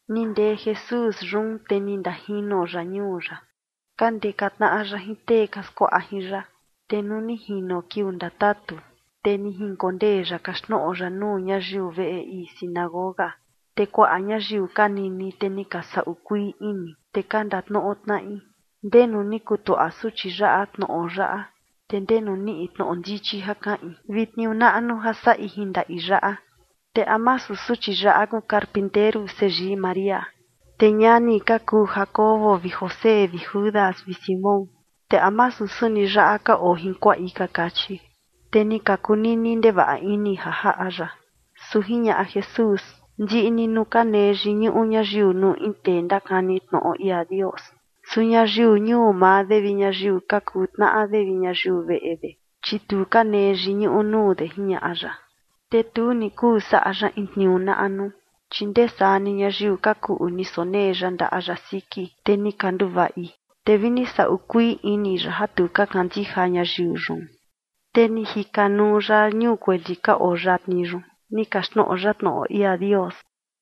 Ni ndee Jesús yun, te ni ndajino ya ñuu ya, ka ndeka tnaꞌa ya jin tee ka skuaꞌa jin ya. Te nuu ni jino kiuu ndatatu, te ni jinkondee ya kaxtnoꞌo ya nuu ñayiu veꞌe ii sinagoga. Te kuaꞌa ñayiu ka nini, te ni ka saꞌu kuii ini, te ka ndatnoꞌo tnaꞌi: ―¿Ndenu ni kutuaꞌa suchi yaꞌa tnoꞌo yaꞌa? ¿Te ndenu niꞌi tnoꞌo ndichi ja kaꞌin vi tniuu naꞌnu ja saꞌi jin ndaꞌi yaꞌa? ¿Te a masu suchi yaꞌa kuu carpinteru seyii María, te ñani ka kuu Jacobo vi José vi Judas vi Simón? ¿Te a masu suni yaꞌa ka oo jin kuaꞌi? ―ka kachi. Te ni ka kunini ndevaꞌa ini ja jaꞌa ya. Su jiñaꞌa Jesús: ―Ndiꞌi ni nuu ka nee yiñuꞌu ñayiu nuu in tee ndakani tnoꞌo ia Dios. Su ñayiu ñuu maa de vi ñayiu ka kuu tnaꞌa de vi ñayiu veꞌe de, chi tu ka nee yiñuꞌu nuu de ―jiñaꞌa ya. Te tu ni kuu saꞌa ya in tniuu naꞌnu, chi ndee saa ni ñayiu ka kuꞌu ni sonee ya ndaꞌa ya siki, te ni ka nduvaꞌi. Te vi ni saꞌu kuii ini ya ja tu ka kandija ñayiu yun. Te ni jika nuu ya ñuu kueli ka oo yatni yun, ni kaxtnoꞌo ya tnoꞌo ia Dios.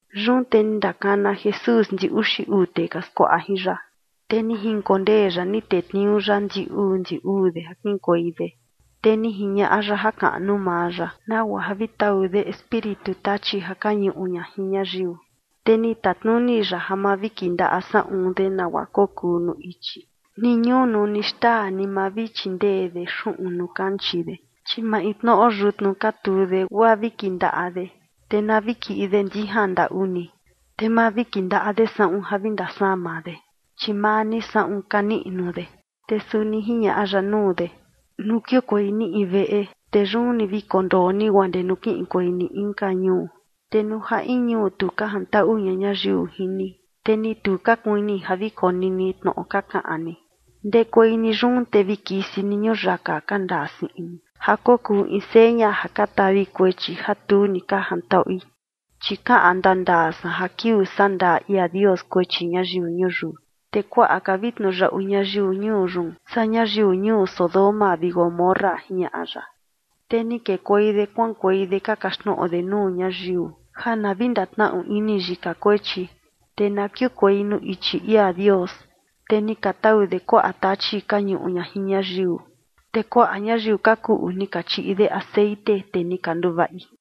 Yun te ni ndakana Jesús ndi uxi uu tee ka skuaꞌa jin ya, te ni jinkondee ya ni tetniuu ya ndi uu ndi uu de ja kiꞌinkuei de. Te ni jiñaꞌa ya jakaꞌnu maa ya, nagua ja vi tau de espíritu tachi ja ka ñuꞌu ña jin ñayiu. Te ni tatnuni ya ja ma vi kindaꞌa saꞌun de nagua kokuu nuu ichi, ni ñunu, ni xtaa, ni ma vi chindee de xuꞌun nuu kanchii de, chi maintnoꞌo yutnu ka tuu de, guaa vi kindaꞌa de. Te na vi kiꞌi de ndijan ndaꞌu ni, te ma vi kindaꞌa de saꞌun ja vi ndasama de, chi maa ni saꞌun ka niꞌnu de. Te suni jiñaꞌa ya nuu de: ―Nuu kiukuei ni in veꞌe, te yun ni vi kondoo ni guaa ndee nuu kiꞌinkuei ni inka ñuu. Te nuu ja in ñuu tu ka jantaꞌu ña ñayiu jin ni, te ni tu ka kuini ja vi konini tnoꞌo ka kaꞌan ni, ndekuei ni yun, te vi kisi ni ñuyaka ka ndaa siꞌin ni ja kokuu in seña ja ka tavi kuechi ja tu ni ka jantaꞌui. Chi kaꞌan ndandaa san ja kiuu sandaa ia Dios kuechi ñayiu ñuyiu, te kuaꞌa ka vi tniuyaꞌu ñayiu ñuu yun saa ñayiu ñuu Sodoma vi Gomorra ―jiñaꞌa ya. Te ni kekuei de kuaꞌankuei de ka kaxtnoꞌo de nuu ñayiu ja na vi ndatnaꞌu ini yika kuechi, te na kiukuei nuu ichi ia Dios. Te ni ka tau de kuaꞌa tachi ka ñuꞌu ña jin ñayiu. Te kuaꞌa ñayiu ka kuꞌu ni ka chiꞌi de texeꞌen, te ni ka nduvaꞌi.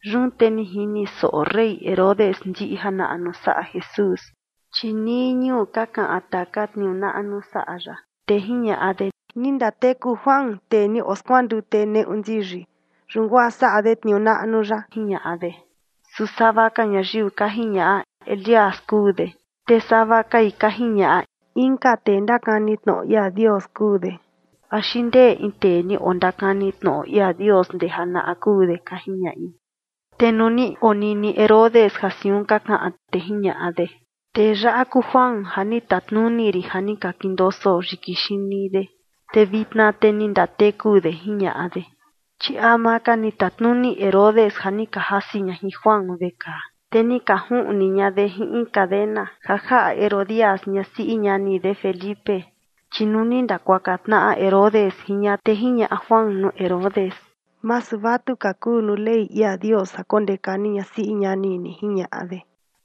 Yun te ni jini soꞌo rey Herodes ndiꞌi janaꞌnu saꞌa Jesús, chi nii ñuu ka kaꞌan taka tniuu naꞌnu saꞌa ya, te jiñaꞌa de: ―¡Ni ndateku Juan, tee ni oskuandute neꞌu ndiyi, yun guaa saꞌa de tniuu naꞌnu yaꞌa! ―jiñaꞌa de. Su sava ka ñayiu ka jiñaꞌa: ―Elías kuu de. Te sava kai ka jiñaꞌa: ―Inka tee ndakani tnoꞌo ia Dios kuu de, axi ndee in tee ni ondakani tnoꞌo ia Dios ndee janaꞌa kuu de ―ka jiñaꞌi. Te nuu ni onini Herodes ja siun ka kaꞌan, te jiñaꞌa de: ―Tee yaꞌa kuu Juan ja ni tatnuni rin ja ni ka kindoso yiki xini de, te vitna te ni ndateku de ―jiñaꞌa de. Chi ama ka ni tatnuni Herodes ja ni ka jasi ña jin Juan vekaa, te ni ka juꞌni ña de jin in cadena, ja jaꞌa Herodías, ñasiꞌi ñani de Felipe. Chi nuu ni ndakuaka tnaꞌa Herodes jin ña, te jiñaꞌa Juan nuu Herodes: ―Masu vatuka kuu nuu Ley ia Dios ja kondeka ni ñasiꞌi ñani ni ―jiñaꞌa de.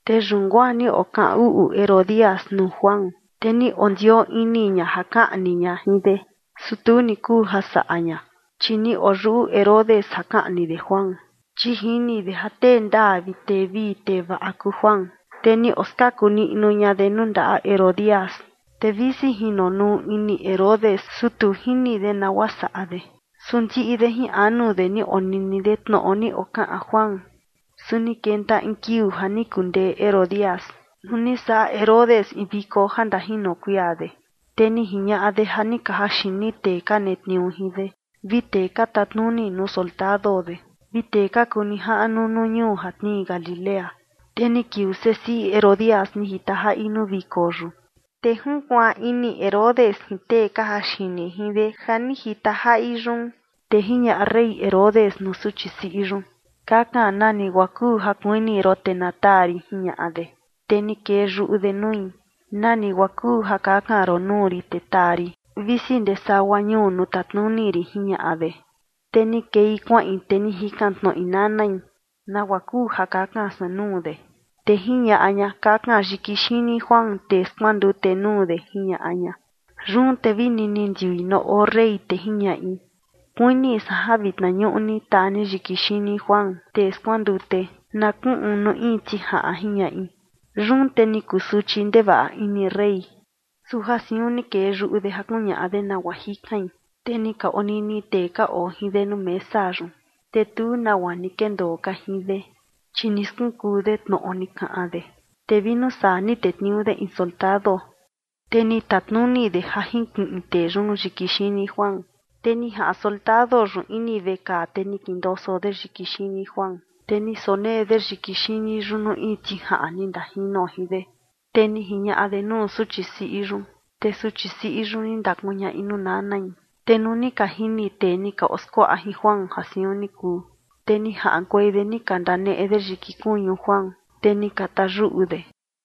Te yun guaa ni okaꞌan uꞌu Herodías nuu Juan, te ni ondioo ini ña ja kaꞌni ña jin de, su tu ni kuu ja saꞌa ña. Chi ni oyuꞌu Herodes ja kaꞌni de Juan, chi jini de ja tee ndaa vi tee vii tee vaꞌa kuu Juan, te ni oskaku niꞌnu ña de nuu ndaꞌa Herodías. Te visi jinonuu ini Herodes, su tu jini de nagua saꞌa de, su ndiꞌi de jin anu de ni onini de tnoꞌo ni okaꞌan Juan. Su ni kenta in kiuu ja ni kundee Herodías, nuu ni saꞌa Herodes in viko ja ndajino kuia de, te ni jiñaꞌa de ja ni ka jaxini tee ka netniuu jin de, vi tee ka tatnuni nuu soldado de vi tee ka kuu nijaꞌnu nuu ñuu ja tnii Galilea. Te ni kiuu sesiꞌi Herodías ni jita jaꞌi nuu viko yun. Te junkuaan ini Herodes jin tee ka jaxini jin de ja ni jita jaꞌi yun. Te jiñaꞌa rey Herodes nuu suchi siꞌi yun: ―Kakan nani guaa kuu ja kuini ron, te na taa rin ―jiñaꞌa de. Te ni kee yuꞌu de nui: ―Nani guaa kuu ja kakan ron nuu rin te taa rin, visi ndee sagua ñuu nuu tatnuni rin ―jiñaꞌa de. Te ni kei kuaꞌin, te ni jikan tnoꞌi nanai: ―¿Nagua kuu ja kakan san nuu de? Te jiñaꞌa ña: ―Kakan yiki xini Juan, tee skuandute, nuu de ―jiñaꞌa ña. Yun te vini ni ndiui nuu oo rey, te jiñaꞌi: ―Kuini san ja vitna ñuꞌu ni, taa ni yiki xini Juan, tee skuandute, na kuꞌun nuu in tijaꞌan ―jiñaꞌi. Yun te ni kusuchi ndevaꞌa ini rey, su ja siun ni kee yuꞌu de ja kuñaꞌa de nagua jikain, te ni ka onini tee ka oo jin de nuu mesa yun, te tu nagua ni kendoo ka jin de, chi ni skunkuu de tnoꞌo ni kaꞌan de. Te vi nuu saa ni tetniuu de in soldado, te ni tatnuni de ja jinkiꞌin tee yun yiki xini Juan. Te ni jaꞌan soldado yun ini vekaa, te ni kindoso de yiki xini Juan, te ni sonee de yiki xini yun nuu in tijaꞌan ni ndajino jin de, te ni jiñaꞌa de nuu suchi siꞌi yun, te suchi siꞌi yun ni ndakuñaꞌi nuu nanai. Te nuu ni ka jini tee ni ka oskuaꞌa jin Juan ja siun ni kuu, te ni jaꞌankuei de ni ka ndaneꞌe de yiki kuñu Juan, te ni ka tayuꞌu de.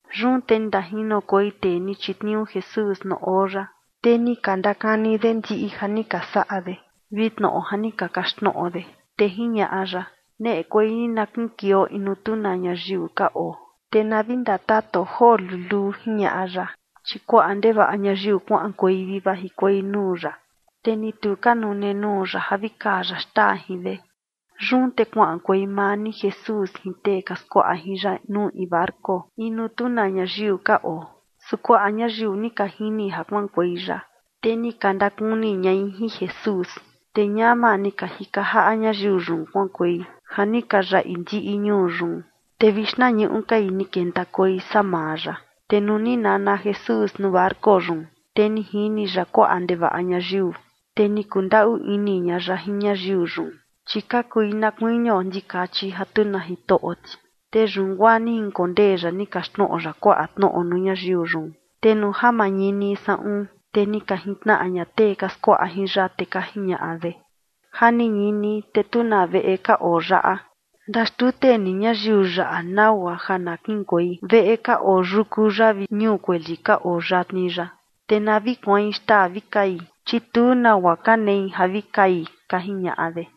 Yun te ni ndajinokuei tee ni chitniuu Jesús nuu oo ya, te ni ka ndakani de ndiꞌi ja ni ka saꞌa de vi tnoꞌo ja ni ka kaxtnoꞌo de. Te jiñaꞌa ya: ―Neꞌekuei ni na kiꞌinkueio in nuu tu na ñayiu ka oo, te na vi ndatatuo joo luluu ―jiñaꞌa ya. Chi kuaꞌa ndevaꞌa ñayiu kuaꞌankuei vi vajikuei nuu ya, te ni tu ka nune nuu ya ja vi kaa ya xtaa jin de. Yun te kuaꞌankuei maa ni Jesús jin tee ka skuaꞌa jin ya nuu in barco in nuu tu na ñayiu ka oo. Su kuaꞌa ñayiu ni ka jini ja kuaꞌankuei ya, te ni ka ndakuni ñai jin Jesús. Te ñama ni ka jika jaꞌa ñayiu yun kuaꞌankuei ja ni ka yaꞌi ndiꞌi ñuu yun, te vi xtnañuꞌu kai ni kentakuei saa maa ya. Te nuu ni nana Jesús nuu barco yun, te ni jini ya kuaꞌa ndevaꞌa ñayiu, te ni kundaꞌu ini ña ya jin ñayiu yun, chi ka kui na kuinio ndikachi ja tu na jitoꞌo ti. Te yun guaa ni jinkondee ya ni kaxtnoꞌo ya kuaꞌa tnoꞌo nuu ñayiu yun. Te nuu ja mañini saꞌun, te ni ka jintnaꞌa ña tee ka skuaꞌa jin ya, te ka jiñaꞌa de: ―Ja ni ñini, te tu na veꞌe ka oo yaꞌa. Ndaxtute ni ñayiu yaꞌa nagua ja na kiꞌinkuei veꞌe ka oo yuku yaꞌa vi ñuu kueli ka oo yatni yaꞌa, te na vi kuain xtaa vi kai, chi tu nagua ka nei ja vi kai ―ka jiñaꞌa de.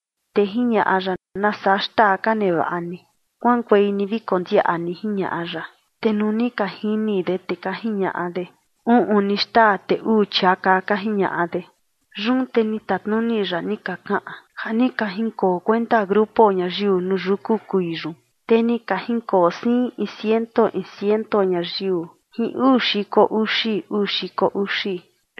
Te jiñaꞌa ya: ―¿Nasaa xtaa ka nevaꞌa ni? Kuaꞌankuei ni vi kondiaꞌa ni ―jiñaꞌa ya. Te nuu ni ka jini de, te ka jiñaꞌa de: ―Uꞌun ni xtaa te uu chiaka, ―ka jiñaꞌa de. Yun te ni tatnuni ya ni ka kaꞌan ja ni ka jinkoo kuenta grupo ñayiu nuu yuku kuii yun. Te ni ka jinkoo siin in ciento in ciento ñayiu jin uu xiko uxi, uu xiko uxi.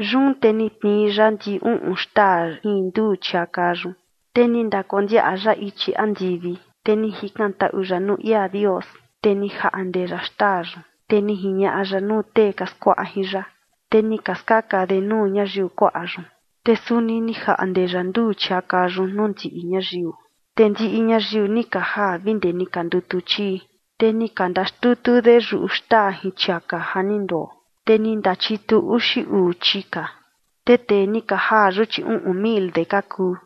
Yun te ni tnii ya ndi uꞌun xtaa jin nduu chiaka yun, te ni ndakondiaꞌa ya ichi andivi, te ni jikantaꞌu ya nuu ia Dios, te ni jaꞌnde ya xtaa yun, te ni jiñaꞌa ya nuu tee ka skuaꞌa jin ya, te ni ka skaka de nuu ñayiu kuaꞌa yun. Te suni ni jaꞌnde ya nduu chiaka yun nuu ndiꞌi ñayiu. Te ndiꞌi ñayiu ni ka jaa vi ndee ni ka ndutu chii. Te ni ka ndaxtutu de yuꞌu xtaa jin chiaka ja ni ndoo, te ni ndachitu uxi uu chika. Te tee ni ka jaa yun, chi uꞌun mil de ka kuu.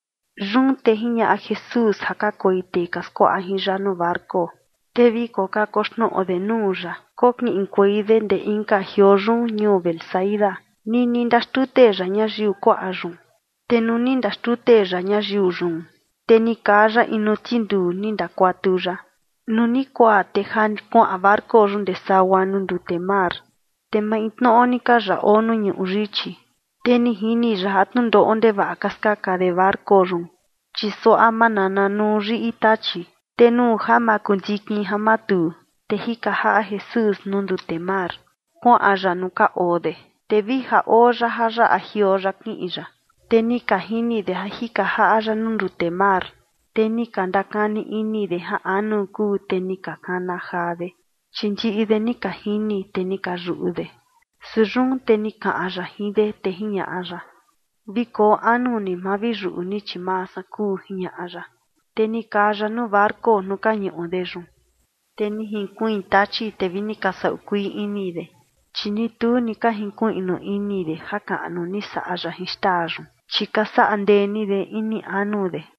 Yun te jiñaꞌa Jesús ja kakuei tee ka skuaꞌa jin ya nuu barco, te vi kokakoxnoꞌo de nuu ya kokiꞌinkuei de ndee inka jioo yun, ñuu Betsaida, nini ndaxtute ya ñayiu kuaꞌa yun. Te nuu ni ndaxtute ya ñayiu yun, te ni kaa ya in nuu tinduu, ni ndakuatu ya. Nuu ni kuaa, te ja kuaꞌan barco yun ndee sagua nuu ndute mar, te maintnoꞌo ni ka ya oo nuu ñuꞌu yichi. Te ni jini ya ja tnundoꞌo ndevaꞌa ka skaka de barco yun, chi suaꞌa manana nuu yiꞌi tachi. Te nuu ja makundikin ja matuu, te jika jaꞌa Jesús nuu ndute mar, kuaꞌan ya nuu ka oo de, te vi ja oo ya ja yaꞌa jioo ya kiꞌin ya. Te ni ka jini de ja jika jaꞌa ya nuu ndute mar, te ni ka ndakani ini de ja anu kuu, te ni ka kana jaa de. Chi ndiꞌi de ni ka jini, te ni ka yuꞌu de. Su yun te ni kaꞌan ya jin de, te jiñaꞌa ya: ―Vi koo anu ni, ma vi yuꞌu ni, chi maa san kuu ―jiñaꞌa ya. Te ni kaa ya nuu barco nuu ka ñuꞌu de yun, te ni jinkuiin tachi, te vi ni ka saꞌu kuii ini de. Chi ni tu ka jinkuiꞌnu ini de jakaꞌnu ni saꞌa ya jin xtaa yun, chi ka saꞌa ndee ni de ini anu de.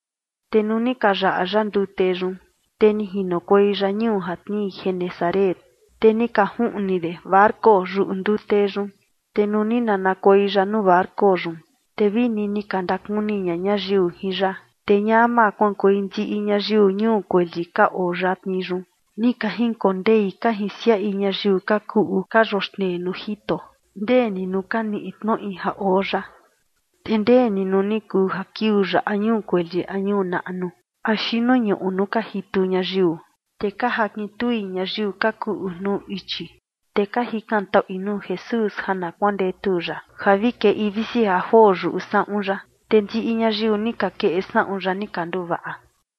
Te nuu ni ka yaꞌa ya ndute yun, te ni jinokuei ya ñuu ja tnii Genesaret. Te ni ka juꞌni de barco yuꞌu ndute yun. Te nuu ni nanakuei ya nuu barco yun, te vini ni ka ndakuni ña ñayiu jin ya. Te ñama kuaꞌankuei ndiꞌi ñayiu ñuu kueli ka oo yatni yun, ni ka jinkondei ka jinsiaꞌi ñayiu ka kuꞌu ka yoxnei nuu jito, ndee ni nuu ka niꞌi tnoꞌi ja oo ya. Te ndee ni nuu ni kuu ja kiuu ya a ñuu kueli a ñuu naꞌnu axi nuu ñuꞌu nuu ka jitu ñayiu, te ka jakin tui ñayiu ka kuꞌu nuu ichi, te ka jikantaꞌui nuu Jesús ja na kuandetu ya ja vi keꞌi visi ja joo yuꞌu saꞌun ya. Te ndiꞌi ñayiu ni ka keꞌe saꞌun ya ni ka nduvaꞌa.